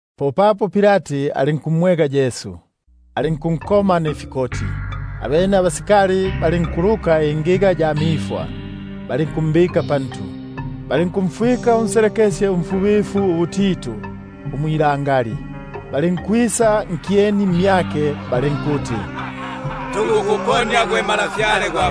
Popapo Pilati alinkumwega Yesu, alinkunkoma nifikoti. Abene abasikali balinkuluka ingiga ya mifwa, balinkumbika pantu, balinkumfwika unselekesye umfubifu ubutitu; balinkwisa kumyake balinkuti: Tukukuponia gwe Ntwa gwa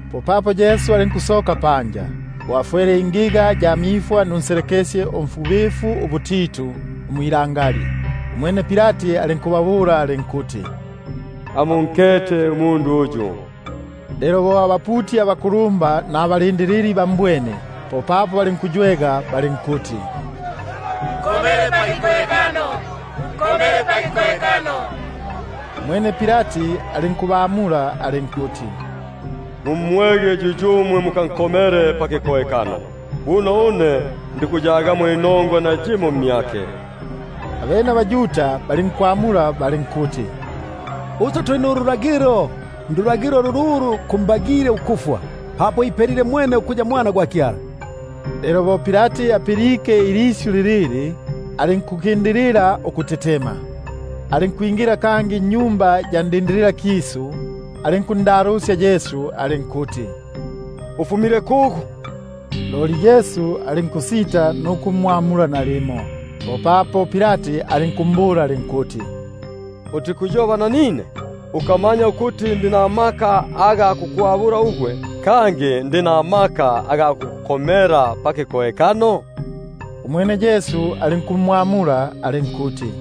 Popapo Yesu alinkusoka panja, bo afwele ingiga ya mifwa nunselekesye umfubifuubutitu. Umwene Pilati alinkuba- bula alinkuti: Amunkete umundu uyu! Lelo bo abaputi abakulumba nababombi bambwene, popapo balinkuywega balinkuti: Nkomele pakikohekano, nkomele pakikohekano. Umwene Pilati alinkubabula alinkuti: Mumwege yuyumwe mukankongege pakikohekano; buno une ndikuyagamo nayimo inongwa mmyake. Abene abaYuda balinkumwamula balinkuti: Uswe tuli nululagilo, ndulagilo lululu kumbagile ukufwa, papo ipelile mwene ukuya Mwana gwa Kyala. Lelo bo Pilati apilike ilisyu lilili, alinkukindapo ukutetema. Alinkwingila kangi nnyumba ya bulindililakisu, alinkundalusya Yesu alinkuti: Ufumile kugu? Loli Yesu alinkusita nuku- mwamula nalimo. Popapo Pilati alinkumbula alinkuti: Utikuyoba nanine? Ukamanya ukuti ndi namaka ga kukwabulila ugwe, kangi ndi namaka ga kukukomela pakikohekano? Umwene Yesu alinkumwamula alinkuti: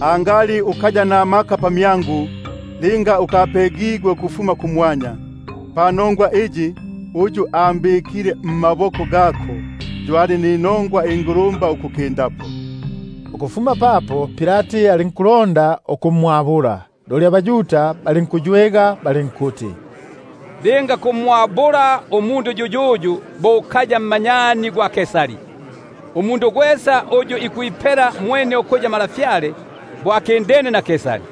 Angali ukaya namaka pamyangu, linga ukapegigwe ukufuma kumwanya; panongwa iyi, uyu ambikile mmaboko gako yo ali ninongwa ukukindapo. Ukufuma papo Pilati alinkulonda ukumwabula, loli abaYuda balinkuywega balinkuti: Linga kumwabula umundu yuyuyu, bo ukaya mmanyani gwa Kaisari; gwesa uyu ikwipela mwene ukuya Ntwa, bo akindene na Kaisari.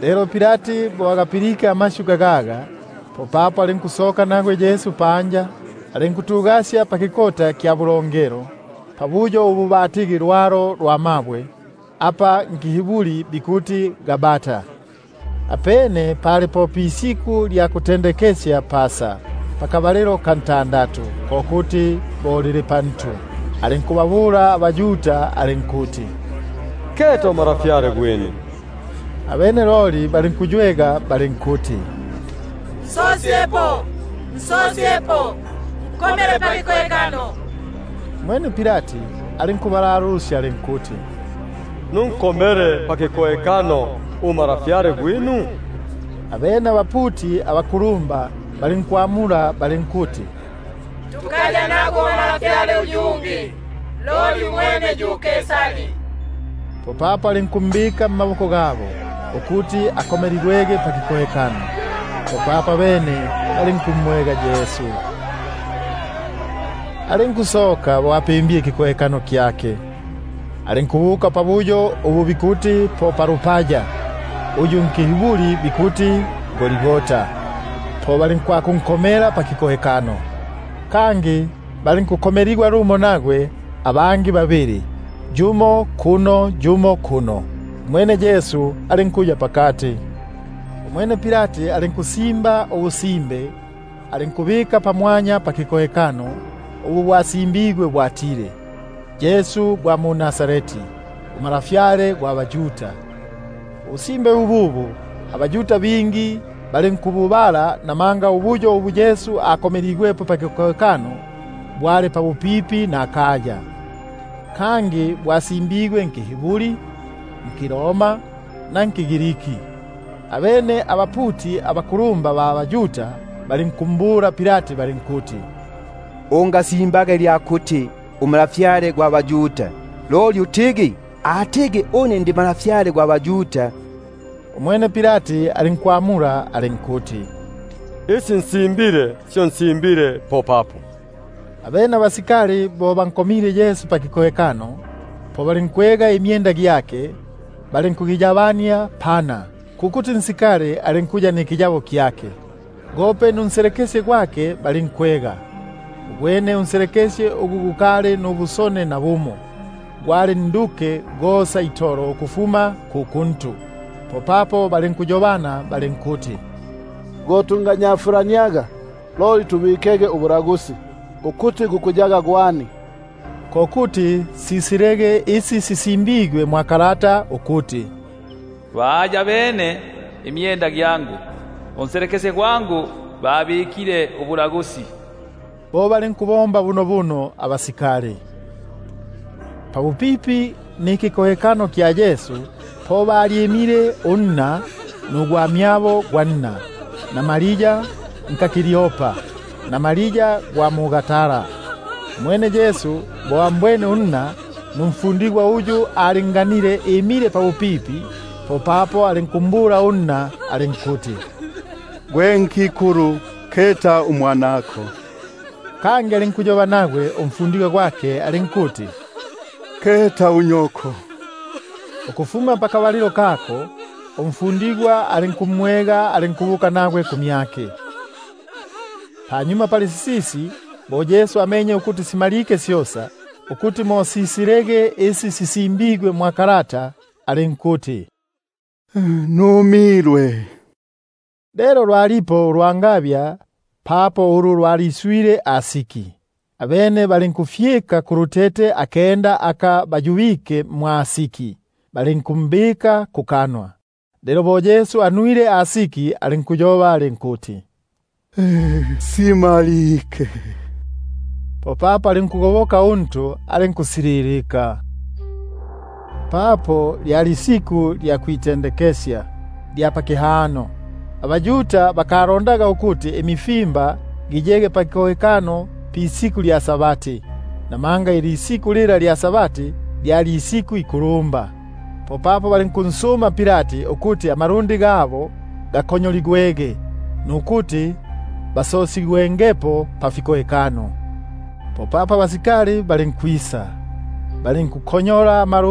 Lelo bo Pilati agapilike amasyu gagaga, popapo alinkusoka nagwe Yesu panja, alinkutugasya pakikota kya bulongelo, pabuyo ubu batigi lwalo lwa mabwe, apa nkiHiburi bikuti Gabata. Apene pali po pisiku lya kutendekesya Pasa, pakabalilo ka ntandatu,#ko kuti bo lili pantu. alinkubabula abaYuda alinkuti: Keta uNtwa gwinu! Abene loli balinkuywega balinkuti: Nsosyepo, nsosyepo, nkomele pakikohekano. Umwene Pilati alinkubalalusya alinkuti: Nunkomele pakihekano uNtwa gwinu? Abene abaputi abakulumba balinkwamula balinkuti: Tukaya nagwe uNtwa uyungi, loli mwene yu Kaisari. Popapo alinkumbika mmaboko gabo, ukuti akomeligwege pakikohekano. Abene balinkumwega Yesu. Popapo alinkusoka bo apimbile ikikohekano kyake, alinkubuka pabuyo ubu bikuti po palupaya, ubu nkiHiburi bikuti Golgata. Po balinkwakunko- mela pakikohekano; kangi balinkukomeligwa lumo nagwe abangi babili, yumo kuno yumo kuno, umwene Yesu alinkuya pakati. Umwene Pilati alinkusimba ubusimbe, alinkububika pamwanya pakikohekano; ubu bwasimbigwe ukuti: YESU GWA MU-NAZARETI, UNTWA GWA BAYUDA. Ubusimbe bububu abaYuda ba bingi balinkububala, namanga ubuyo ubu Yesu akomeligwepo pakikohekano, bwali pabupipi nakaya. Bwasimbigwe nkiHiburi, nkiRoma, na nkiGriki. Abene abaputi abakulumba ba baYuda, balinkumbula Pilati balinkuti: Ungasimbaga ilya kuti: UNtwa gwa baYuda, loli utigi: Atigi une ndi Ntwa gwa baYuda. Umwene Pilati alinkwamula alinkuti: Isi nsimbile syo nsimbile popapo. Abene abasikali bo bankomile pakikohekano Yesu, po balinkwega imyenda gyake balinkugiyabania pana, unsikali gwesa alinkuya nikiyabo kyake, gope nunselekesye gwake balinkwega. Ugwene loli unselekesye ugu gukali nubusone nabumo, gwali nduke gosa itolo ukufuma ku kuntu. Popapo balinkuyobana balinkuti: Go tungagunyafulaniaga, loli mbikege ubulagusi, ukuti gukuyaga gwani; ko kuti mo sisilege isi sisimbigwe ukuti: Bayabene imyenda gyangu, Panselekesye gwangu babikile ubulagusi. Bo balinkubomba bunobuno abasikali. Lelo pabupipi nikikohekano kya Yesu, po balyimile unna, nugwamyabo gwa nna, Maria unka Kleopa, na Maria gwa mu-Magdala. Umwene Yesu bo ambwene unna, numfundigwa uyu alinganile imile pabupipi, popapo alinkumbula alinkuti: Gwe nkikulu, keta umwanako! Kangi alinkuyoba kumfundigwa yula alinkuti: Keta unyoko! Ukufuma pakabalilo kako, umfundigwa alinkumwega, alinkubuka nagwe kumyake. Panyuma pali sisisi, bo Yesu amenye ukuti simalike syosa, ko kuti mo sisilege isi sisimbigwe, alinkuti: Numilwe. Lelo lwalipo ulwangabya papo ulu lwaliswile asiki. Abene balinkufyika kulutete akenda aka bayubike mwa asiki, balinku- mbika kukanwa. Lelo bo Yesu anwile asiki, alinkuyoba alinkuti: Simalike. Popapo alinkugoboka untu, alinkusililika. Papo lyali isiku lya kwitendekesya, abaYuda bakalondaga ukuti imifimba giyege pafikohekano pa-Sabati, namanga Sabati yula ali nkulumba, popapo balinkunsuma Pilati ukuti amalundi gabo gakonyoligwege, nukuti basosigwengepo pafiko- hekano. Popapo abasikali balinkwisa, balinkunkonyola ama-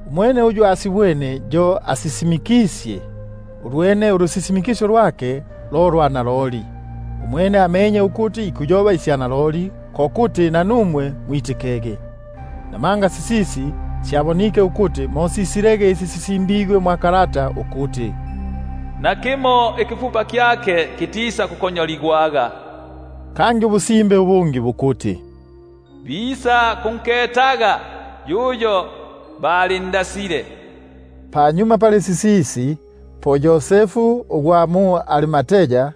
Umwene uyu asibwene yo asisimikisye, ulwene ulusisimikisyo lwake lo lwa naloli; umwene amenye ukuti ikuyoba isya naloli, ko kuti nanumwe mwitikege. Namanga sisisi syabonike ukuti mo sisilege isi sisimbigwe ukuti: Nakimo ikifupa kyake kitisa- kukonyoligwa. Kangi ubusimbe ubungi bukuti: Bisakunketaga yuyo balindasile. Panyuma pali sisisi, po Yosefu ugwa mu-Arimatai,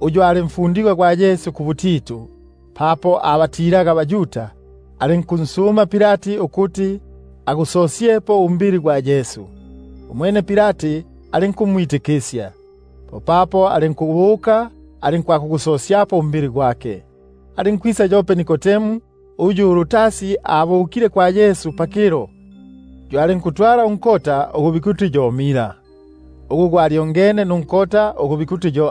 uyu ali mfundigwa gwa Yesu kubutitu papo abatilaga abaYuda, alinkunsuma Pilati ukuti agusosyepo umbili gwa Yesu. Umwene Pilati alinkumwitikisya. Popapo alinkubuka, ali- nkwakugusosyapo umbili gwake. Alinkwisa yope Nikodemu, uyu ulutasi abukile kwa Yesu pakilo, yo alinkutwala unkota ugu bikuti yo mira, ugu gwalyongene nunkota ugu bikuti yo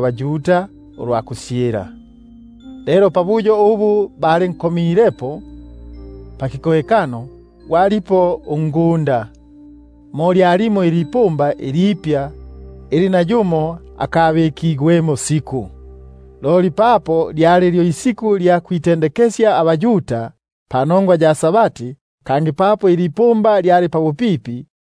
baYuda ulwa kusyilila. Lelo pabuyo ubu balinkomilepo pakikohekano, gwalipo ungunda, mo lyalimo ilipumba ilipya ili nayumo akabikigwemo siku; mo balinkumbika Yesu, papo lyali lyo isiku lya kwitendekesya abaYuda, kangi ilipumba lyali pabupipi.